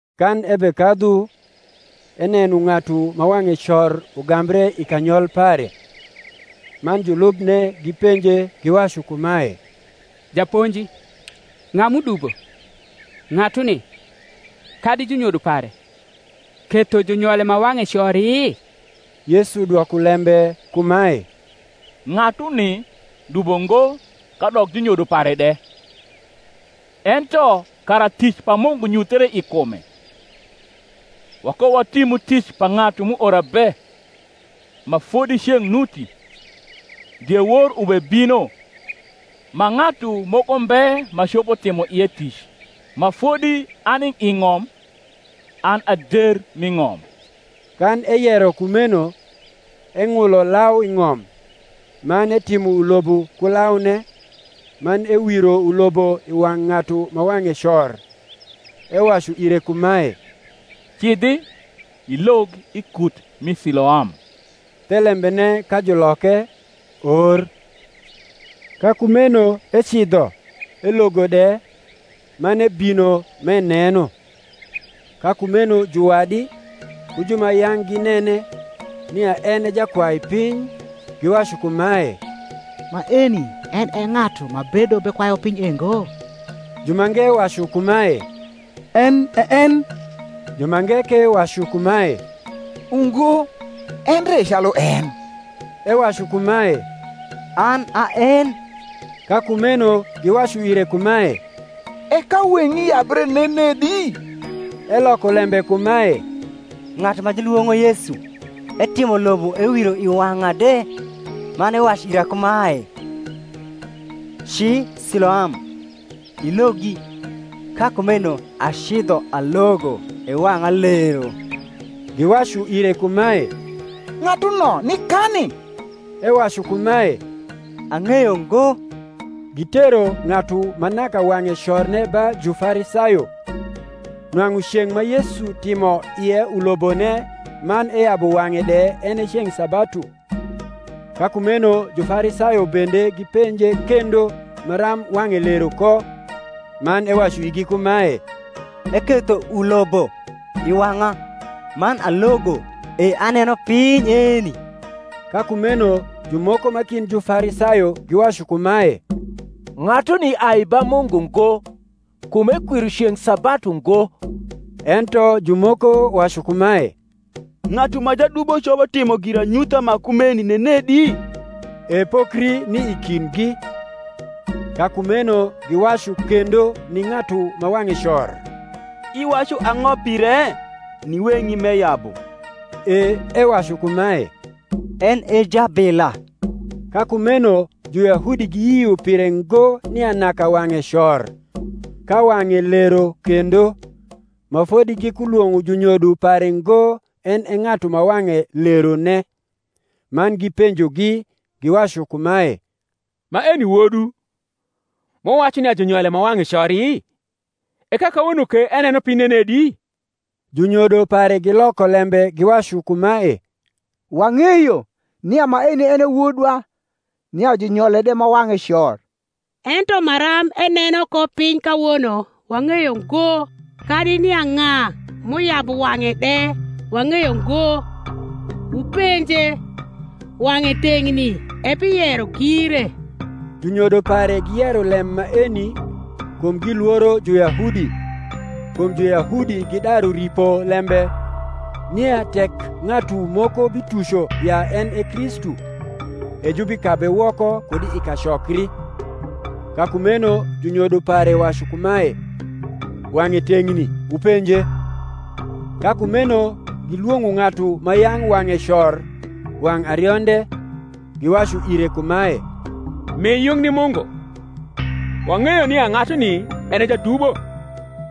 Kan ebekadhu, eneno ng’atu ma wang’e cor ugambre i kanyol pare. Man julubne gipenje, giwacu kumae, Japonji, ng’a m’udubo, ng’atuni, kadi junyodo pare, ketho junyole ma wang’e cori? Yesu dwoko lembe kumae, Ng’atuni dubo ngo kadok junyodo pare de: ento kara tic pa Mungu nyuthre i kume. Wakowatimu tic pa ng’atu m’uora be, ma fodi ceng’ nuti: diewor ubebino, ma ng’atu moko mbe ma copo timo ie tic. Ma fodi ani i ng’om, an a der mi ng’om. Kan eyero kumeno, eng’ulo lau i ng’om, man etimo ulobo ku laune, man ewiro ulobo i wang’ ng’atu ma wang’e cor, ewacu ire kumae, Cidhi, ilog i kut mi Siloam (thelembene ka juloke, Or). Ka kumeno ecidho, elogo de, man ebino m’eneno. Ka kumeno juwadi, ku ju ma yang’ ginene, nia en e jakwaipiny, giwacu kumae, Maeni en e ng’atu ma bedo bekwayu piny e ngo? Jumange wacu kumae, En e en: jumange ke wacu kumae, Ungo, endre e calu en. Ewacu kumae, An a en. Ka kumeno giwacu ire kumae, E ka weng’i yabre nenedi? Eloko lembe kumae, Ng’atu ma julwong’o Yesu etimo ulobo ewiro i wang’a de, man ewacu ira kumae, Ci Siloam, ilogi: ka kumeno acidho alogo, e wang’a lero. Giwacu ire kumae, Ng’atuno nikani? Ewacu kumae, Ang’eyo ngo. Gitero ng’atu ma naka wang’e corne ba Jufarisayo. Nwang’u ceng’ ma Yesu timo ie ulobone man eyabu wang’e de en e ceng’ sabatu. Ka kumeno Jufarisayo bende gipenje kendo maram wang’e lero ko. Man ewacu igi kumae, Eketho ulobo i wang’a, man alogo, e aneno piny eni. Ka kumeno jumoko ma kind Jufarisayo giwacu kumae, Ng’atuni ai ba Mungu ngo, kum ekwiro ceng’ sabatu ngo. Ento jumoko wacu kumae, Ng’atu ma jadubo copo timo giranyutha ma kumeni nenedi? E pokri ni i kindgi. Ka kumeno giwacu kendo ni ng’atu ma wang’e cor, Iwacu ang’o pire, ni weng’i m’eyabu? E ewacu kumae, En e jabila. Ka kumeno Juyahudi giyio pire ngo nia naka wang’e cor, ka wang’e lero kendo, ma fodi gikulwong’o junyodo pare ngo en e ng’atu ma wang’e lerone, man gipenjogi giwacu kumae, Maeni wodwu, ma wuwacu nia junyole ma wang’e cori? e ka kawono ke eneno piny nenedi? Junyodo pare gioko lembe giwacu kumae, Wang’eyo nia maeni en e wodwa, nia junyole de ma wang’e cor: ento maram eneno ko piny kawono, wang’eyo ngo; kadi nia ng’a m’uyabu wang’e de wang’eyo ngo: wupenje; wang’e teng’ni, ebiyero gire. Junyodo pare giyero lem maeni, kum gilworo Juyahudi: kum Juyahudi gidaru ripo lembe, nia tek ng’atu moko bituco ya en e Kristu, e jubikabe woko kud i kacokri. Ka kumeno junyodo pare wacu kumae, Wang’e teng’ni; wupenje. Ka kumeno gilwong’o ng’atu ma yang’ wang’e cor wang’ arionde, giwacu ire kumae, Mi yung ni Mungu: wang’eyo nia ng’atuni en e jadubo.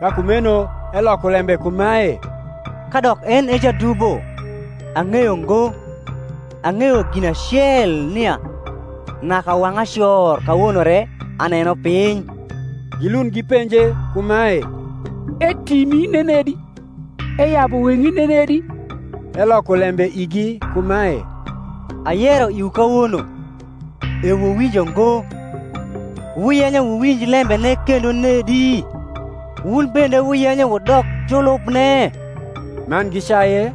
Ka kumeno eloko lembe kumae, Kadok en e jadubo, ang’eyo ngo: ang’eyo gin acel, nia, naka wang’a cor, kawono re aneno piny. Gilund gipenje kumae, Etimi nenedi? eyabu weng’i nenedi? Eloko lembe igi kumae, Ayero iwu kawono, e wuwinjo ngo; wuyenyo wuwinj lembene kendo nedi? wun bende wuyenyo wudok julubne? Man gicaye,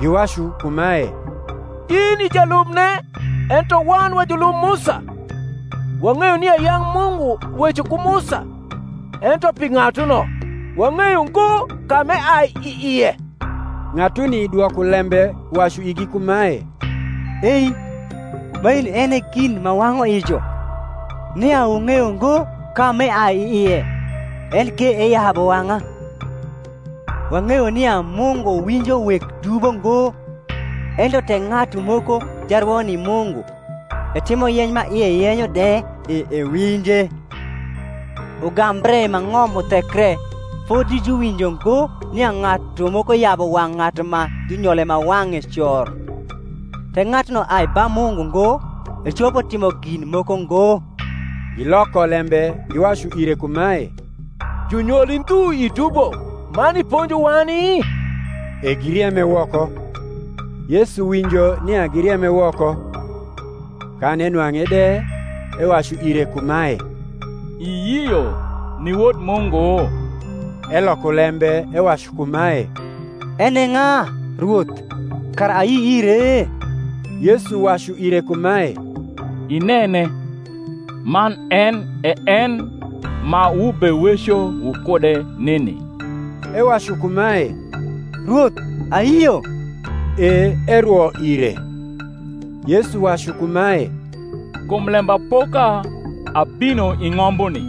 giwacu kumae, In i jalubne; ento wan wa julub Musa. Wang’eyo nia yang’ Mungu weco ku Musa: ento pi ng’atuno, wang’eyo ngo ka m’eai i ie. Ng’atuni dwoko lembe wacu igi kumae, Ei, maeni en e gin ma wang’u ijo, nia wung’eyo ngo ka m’eai i ie, enke eyabu wang’a. Wang’eyo nia Mungu winjo weg dubo ngo: ento tek ng’atu moko jarwo ni Mungu, etimo yeny ma ie yenyo de, e ewinje. Ugambre ma ng’om uthekre fodi juwinjo ngo nia ng’atu moko yabu wang’ ng’atu ma junyole ma wang’e cor. Tek ng’atuno ai ba Mungu ngo, ecopo timo gin moko ngo. Giloko lembe giwacu ire kumae, Junyoli ndhu i dubo, man iponjo wani? E girieme woko. Yesu winjo nia girieme woko; kan enwang’e de, ewacu ire kumae, Iyio ni Wod Mungu? Eloko lembe ewacu kumae, En e ng’a, Rwoth, kara ayi ire? Yesu wacu ire kumae, Inene, man en e en ma wubeweco wukude nini. Ewacu kumae, Rwoth, ayio. E erwo ire. Yesu wacu kumae, Kum lembapoka abino i ng’ombuni,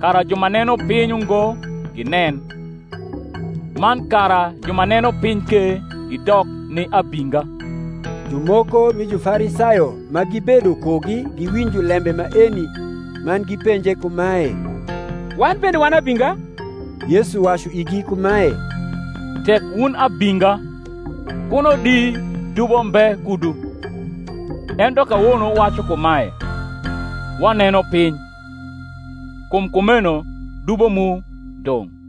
kara ju ma neno piny ungo ginen; man kara ju ma neno piny ke gidok ni abinga. Jumoko mi Jufarisayo ma gibedo kugi giwinjo lembe maeni, man gipenje kumae, Wan bende wan abinga? Yesu wacu igi kumae, Tek wun abinga, kuno di dubo mbe kudu: ento kawono wuwacu kumae, Waneno piny: kum kumeno dubo mu dong’.